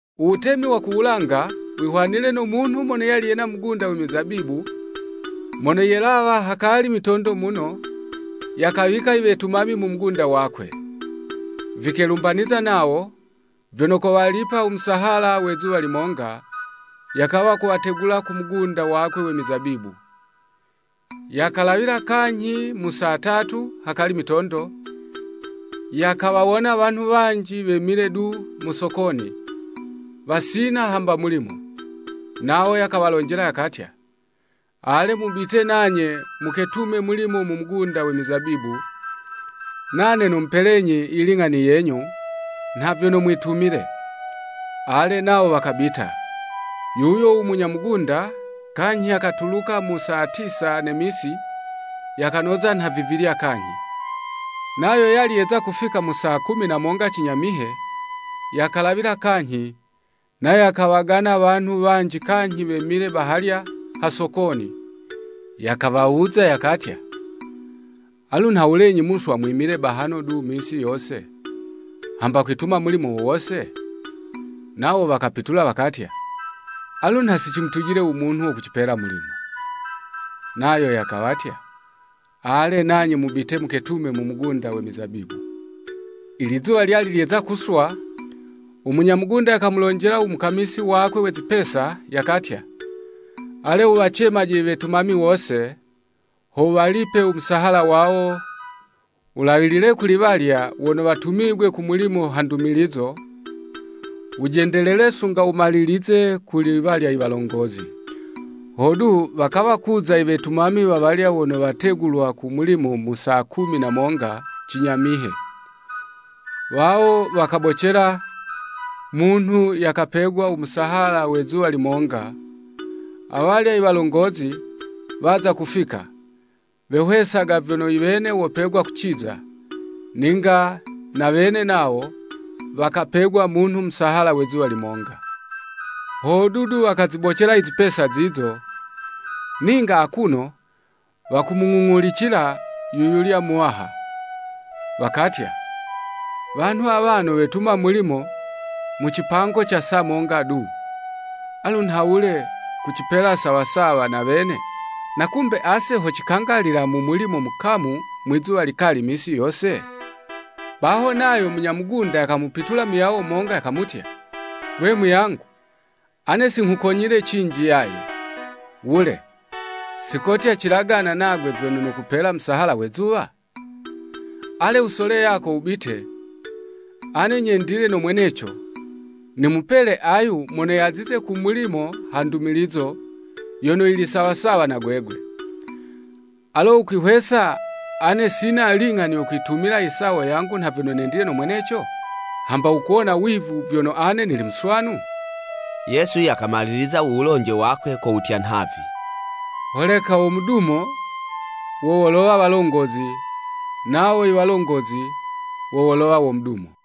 “U Wutemi wa ku wulanga wihwanile no munhu mono yali yena u mugunda we mizabibu, mono yelawa hakali mitondo muno, yakawika iwetumami mu mugunda wakwe. Vikelumbaniza nawo, vyono kowalipa u musahala we zuwa limonga, yakawa kuwategula ku mugunda wakwe we mizabibu. Yakalawila kanyhi mu saa tatu hakali mitondo, yakawawona wanhu wanji wemile du mu sokoni, wasina hamba mulimo Nawo yakawalonjela yakatya, ‘Ale, mubite nanye muketume mulimo mu mugunda we mizabibu, nane nomupelenyi yiling'ani yenyu, nha vyono mwitumile.’ Ale, nawo wakabita. Yuyo u munya mugunda, kanyhi yakatuluka mu saa tisa ne misi, yakanoza nha vivilya kanyhi. Nayo yali yeza kufika mu saa kumi na monga, cinyamihe, yakalawila kanyhi, nayo yakawagana wanhu wanji kanyhi wemile bahalya ha sokoni. Yakawawuza, yakatya, ‘Alu nhawulenyi muswa mwimile bahano du misi yose, hamba kwituma mulimo wo wose?’ Nawo wakapitula wakatya, ‘Alu nha si cimutujile u munhu wo kucipela u mulimo.’ Nayo yakawatya, ‘Ale nanye mubite muketume mu mugunda we mizabibu.’ “Ilizuwa lyali lyeza kuswa, u munya mugunda yakamulonjela u mukamisi wakwe, we zipesa, yakatya, ‘Ale wuwacemaje iwetumami wose, ho wuwalipe u musahala wawo wulawilile kuli walya wono watumigwe ku mulimo ha ndumilizo wujendelele sunga wumalilizize kuli walya i walongozi.’ Hodu, wakawa kuza iwetumami wawalya wono wategulwa ku mulimo mu saa kumi na monga cinyamihe, wawo wakabocela, munhu yakapegwa u musahala we zuwa limonga. Awalya i walongozi waza kufika, wehwesaga vyono iwene wopegwa kuciza, ninga na wene nawo wakapegwa, munhu musahala we zuwa limonga. Hodu du wakazibocela izipesa zizo, ninga akuno wakumung'ung'ulicila yu yulya muwaha. Wakatya, ‘Wanhu awano wetuma mulimo mu cipango ca saa monga du, alu nhawule kucipela sawa sawa na wene, na kumbe ase ho cikangalila mu mulimo mukamu mwi'zuwa likali misi yose?’ Baho nayo munya mugunda yakamupitula muyawo yumonga yakamutya, ‘Gwe muyangu, ane si nghukonyile cinji yaye. Wule, sikotya cilagana nagwe vyono nokupela u musahala we zuwa? Ale wusole yako, wubite. Ane nyendile no mweneco, nimupele ayu mono yazize ku mulimo ha ndumilizo, yono yili sawa sawa na gwegwe. Alo wukwihwesa ane sina ling'ani yo kwitumila i sawo yangu nha vyono nendile no mweneco? Hamba wukuwona wivu vyono ane nili muswanu?’” Yesu yakamaliliza u wulonje wakwe ko wutya nhavi, “Holeka wo mudumo, wo wolowa walongozi, nawo i walongozi, wo wolowa wo mudumo.”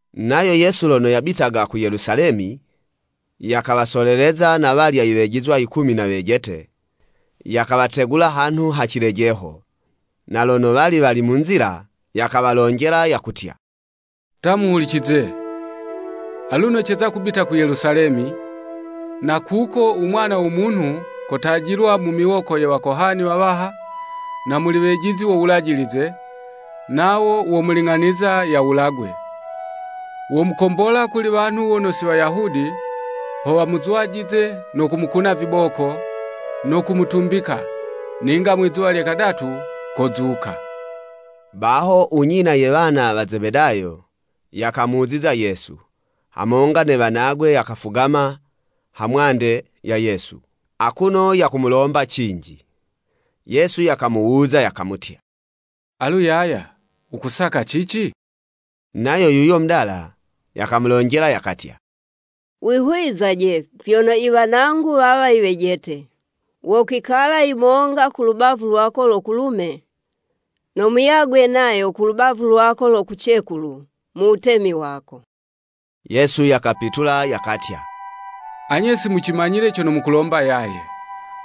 Nayo Yesu lono yabitaga ku Yelusalemi, yakawasoleleza na walya iwejizwa yikumi na wejete, yakawategula hanhu ha cilejeho, na lono wali wali mu nzila, yakawalonjela yakutya, “Ta muhulicize, aluno ceza kubita ku Yelusalemi, na kuko, u Mwana wo Munhu kotajilwa mu miwoko ye wakohani wawaha na muli wejizi wo Wulajilize, nawo womuling'aniza yawulagwe. Womukombola kuli wanhu wono si Wayahudi ho wamuzwajize no kumukuna viboko, no kutumbikwa, ninga mwi'zuwa lye kadatu kozuka.” Baho u nyina ye wana wa Zebedayo, yakamuziza Yesu, hamonga ne wanagwe yakafugama ha mwande ya Yesu, akuno yakumulomba cinji. Yesu yakamuwuza yakamutya, Alu yaya, wukusaka cici? Nayo yuyo mudala, yakamulonjela yakatya, “Wihuwizaje vyono i wanangu wawa iwejete, wokwikala yumonga ku lubavu lwako lo kulume, no muyagwe nayo kulubavu lwako lo kucekulu, mu Wutemi wako.” Yesu yakapitula, yakatya, “Anye si mucimanyile cono mukulomba yaye.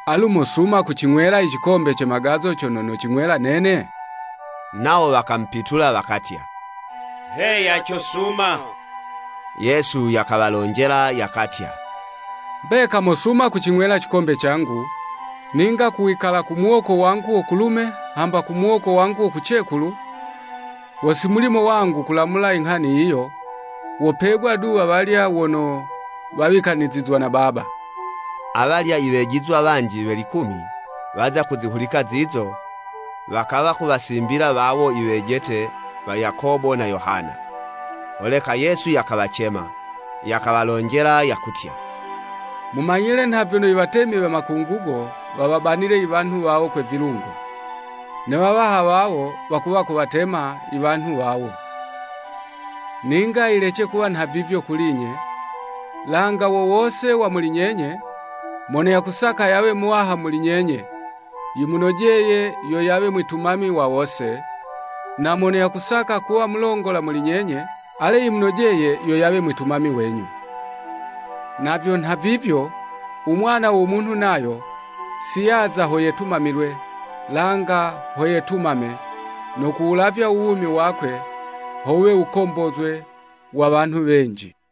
Alu mosuma kucing'wela icikombe ce magazo cono nocing'wela nene?” Nawo wakamupitula wakatya, “Heya cosuma.” Yesu yakawalonjela yakatya, “Mbeka mosuma kucing'wela cikombe cangu, ninga ku wikala ku muwoko wangu wo kulume hamba ku muwoko wangu wo kucekulu, wo si mulimo wangu kulamula inghani yiyo, wopegwa du wawalya wono wawikanizizwa na Baba.” Awalya i wejizwa wanji we likumi, waza kuzihulika zizo, wakawa kuwasimbila wawo iwejete wa Yakobo na Yohana. Holeka Yesu yakawacema, yakawalonjela yakutya, “Mumanyile nha vyono iwatemi we makungugo wawabanile i wanhu wawo kwe vilungo, ne wawaha wawo wakuwa kuwatema I wanhu wawo. Ninga yilece kuwa nha vivyo kuli'nye, langa wo wose wa muli nyenye, mono yakusaka yawe muwaha muli nyenye, yimunojeye yo yawe mwitumami wa wose, na mono yakusaka kuwa mulongola muli nyenye, ale yimunojeye yo yawe mwitumami wenyu. Na vyo nha vivyo, u Mwana wo Munhu nayo, si yaza ho yetumamilwe, langa ho yetumame, no kuwulavya u wumi wakwe ho wuwe wukombozwe wa wanhu wenji.”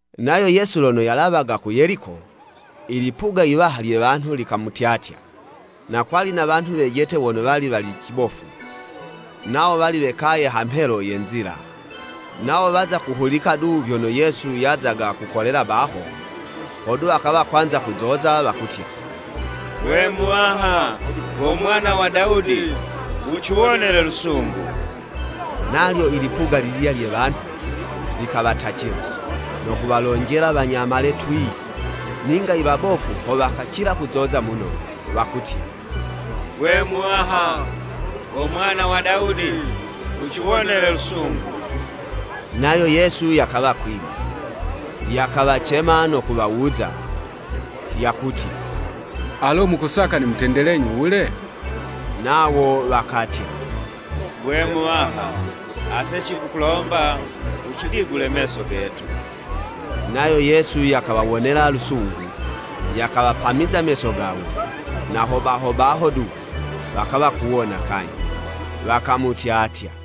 Nayo Yesu lono yalawaga ku Yeliko, i lipuga iwaha lye wanhu likamutyatya. Na kwali na wanhu wejete wono wali wali cibofu, nawo wali wekaye hamhelo ye nzila, nawo waza kuhulika du vyono Yesu yazaga yakukolela baho, hodu wakawa kwanza kuzoza wakutya, “Gwe Muwaha go Mwana wa Dawudi, wuciwonele lusungu!” Nalyo ilipuga lililya lye wanhu, likawatacila, no kuwalonjela wanyamale twii. Ninga i wabofu ho wakacila kuzoza muno, wakutya, “Gwe Muwaha go Mwana wa Dawudi, wuciwonele lusungu!” Nayo Yesu yakawa kwima, yakawacema no kuwawuza, yakutya, “Alo mukusaka nimutendelenyi wule?” Nawo wakatya, “Gwe Muwaha, ase cikukulomba wucidigule meso getu.” Nayo Yesu yakawawonela lusungu, yakawapamiza meso gawo, na ho baho baho du, wakawa kuwona kanyhi, wakamutyatya.